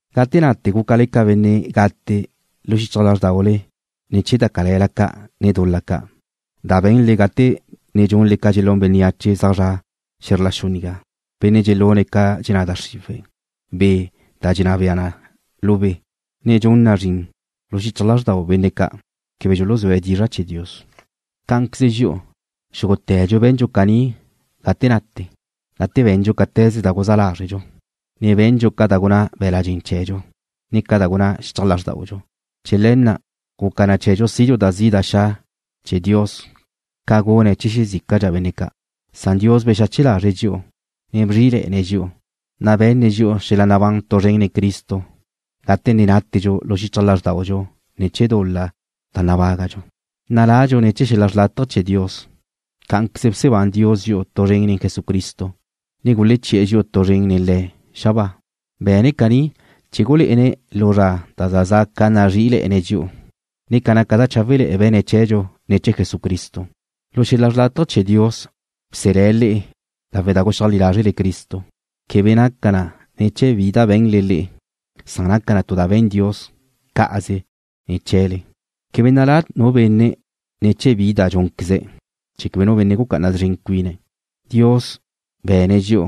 Gate nate gúcale ca benne' gate lu xichaj lázrdaule ne̱ chee̱ da cale̱la ca', ne dul-la ca' da be̱nle gate ne dxunle ca dxelún bénneache zaj zre̱'e xe̱zr la xu nigá, benne' dxelune̱' ca dxenná da xriwe̱', be' na' da dxenná bea na lu be', ne dxun na zrin lu xichaj lázrdau benne' ca' quebe dxuluzúe̱' dizra' chee̱ Dios. Cá'anqueze dxi'u, xúgute̱dxu be̱ndxu caní gate nate, gate be̱ndxu cáte̱ze da guzá lázredxu, ne be̱ndxu ca da gunná be̱la' dxen chee̱dxu, ne ca da gunná xichaj lázrdaudxu. Chee̱ le̱ na' guca na chee̱dxu sidxu da zi' da xa' chee̱ Dios ca gune̱' chee̱ xezícadxa benne' ca', san Dios bexache lázrele̱'e̱ dxi'u, ne bzrí'ile̱'e̱ne̱' dxi'u, na' be̱nne̱' dxi'u xel-la nabán tu zren nen Cristo gate ne nátedxu lu xichaj lázrdaudxu ne̱ chee̱ dul-la da nabágadxu. Naladxu ne̱ chee̱ xel-la xrlátaje chee̱ Dios. Cá'anqueze bsebán Dios dxi'u tu zren nen Jesucristo, ne guleche̱' dxi'u tu zren nen Le̱' xabáa. Be̱ne̱' caní chee̱ gulé'ene̱' lu zra da za za' ca nazrí'ile̱'e̱ne̱' dxi'u, ne ca naca da cháwele̱'e̱ be̱ne̱' chee̱dxu ne̱ chee̱ Jesucristo. Lu xel-la xrlátaje chee̱ Dios bselé̱' le'e lawe' da guxeajlí lázrele Cristo. Quebe naca na ne̱ chee̱ bi da be̱nle le'e, san naca na tu da be̱n Dios cá'aze ne̱ chee̱le. Quebe nalá nu benne' ne̱ chee̱ bi da dxúnqueze̱', chee̱ quebe nu benne' gucá'ana szren cuine̱'. Dios be̱ne̱' dxi'u,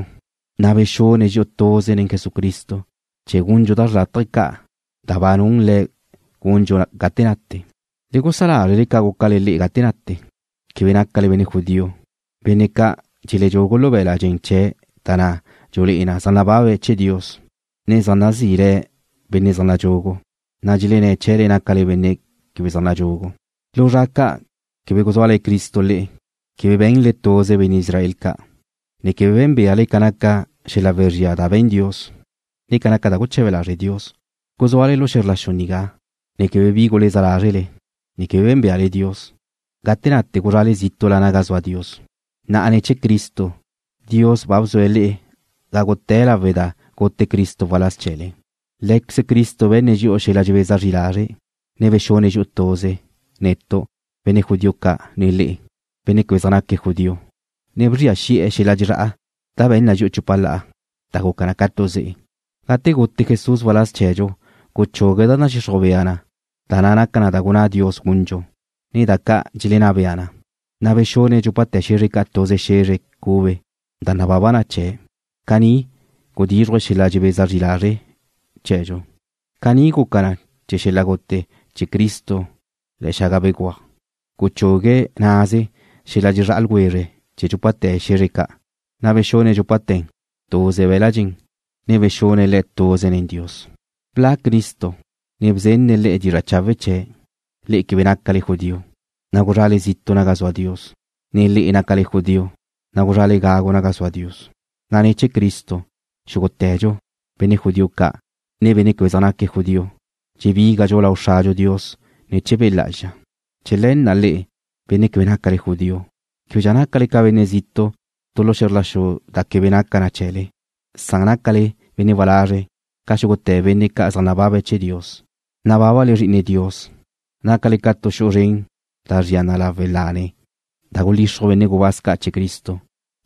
na' bexune̱' dxi'u tuze nen Jesucristo chee̱ gundxu da xrlátaje ca' da ba nun Le̱' gundxu gate nate. Le gusá lázrele ca gúcale le'e gate nate. Quebe nácale benne' judío, benne' ca' dxelechugue̱' lu be̱l-la' dxen chee̱' da na' dxulé'e na zaj nababe̱' chee̱ Dios, ne zaj nazí le̱' benne' zaj nadxugu, na' dxelenné̱' chee̱le nácale benne' quebe zaj nadxugu. Lu zra ca' quebe guzúale̱ Cristo le'e. Quebe be̱nle tuze benne' Israel ca', ne quebe bé̱nbeale ca naca xel-la wezría da be̱n Dios, ne ca naca da guche̱be lazre' Dios. Guzúale lu xe̱zr la xu nigá, ne quebe bi guleza lázrele, ne quebe bé̱nbeale Dios. Gate nate guzrale zítu'la naga zua Dios. Na'a ne̱ chee̱ Cristo Dios ba bzue̱' le'e gágute̱ lawe' da gute Cristo waláz chee̱le. Lé̱queze Cristo be̱nne̱' dxi'u xel-la dxebeza zri lazre', ne bexune̱' dxi'u tuze, netu', benne' judío ca', ne le'e, benne' quebe zaj naque̱' judío, ne bzria xi'e̱ xel-la dxezrá'a da be̱n na dxi'u chupa la'a, da guca na ca tu ze'e. Gate gute Jesús waláz chee̱dxu guchugue̱' da nadxixruj bea na da naca na da gunná Dios gundxu, ne da ca' dxelenná bea na, na' bexune̱' dxúpate̱ xe̱zre ca' tuze xe̱zre cube da nababa na chee̱'. Caní gudíxruje̱' xel-la dxebeza zri lazre' chee̱dxu. Caní guca ne̱ chee̱ xel-la gute chee̱ Cristo le̱'e̱ xaga béguaj, guchugue̱' naze xel-la dxezrá'a ljwezre chee̱ dxúpate̱ xe̱zr ca', na' bexune̱' dxúpate̱ tuze be̱l-la' dxen, ne bexune̱' le̱' tuze nen Dios. Bla' Cristo, ne bzenne̱' le'e dizra' chawe' chee̱', le'e quebe nácale judío, na' guzrale zitu' naga zua Dios, ne le'e nácale judío, na' guzrale gagu naga zua Dios, na' ne̱ chee̱ Cristo, xúgute̱dxu, benne' judío ca', ne benne' quebe zaj naque̱' judío, dxebígadxu lau Xradxu Dios ne̱ chee̱ Be' Lá'azxa. Chee̱ le̱ na' le'e, benne' quebe nácale judío, québedxa nácale ca benne' zitu' tu lu xe̱zr la xu da quebe naca na chee̱le, san nácale benne' walazre' ca xúgute̱ benne' ca' zaj nababa chee̱ Dios. Nabábale Zri'ine Dios. Nácale ca tu xu'u zren da zria na lawe' lane da gulixruj benne' gubáz ca' chee̱ Cristo,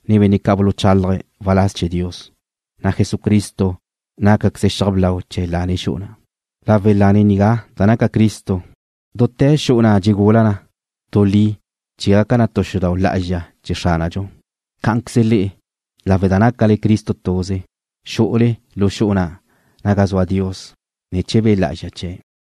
ne benne' ca' buluchálaje̱' waláz chee̱ Dios, na' Jesucristo nácaqueze̱' xiaj blau chee̱ lane xu'u na'. Lawe' lane nigá da naca Cristo, dute̱ xu'u na' dxegula na tu li chee̱ gaca na tu xudau' lá'azxa chee̱ Xránadxu. Cá'anqueze le'e, lawe' da nácale Cristo tuze, xu'ule lu xu'u na' naga zua Dios ne̱ chee̱ Be' Lá'azxa chee̱'.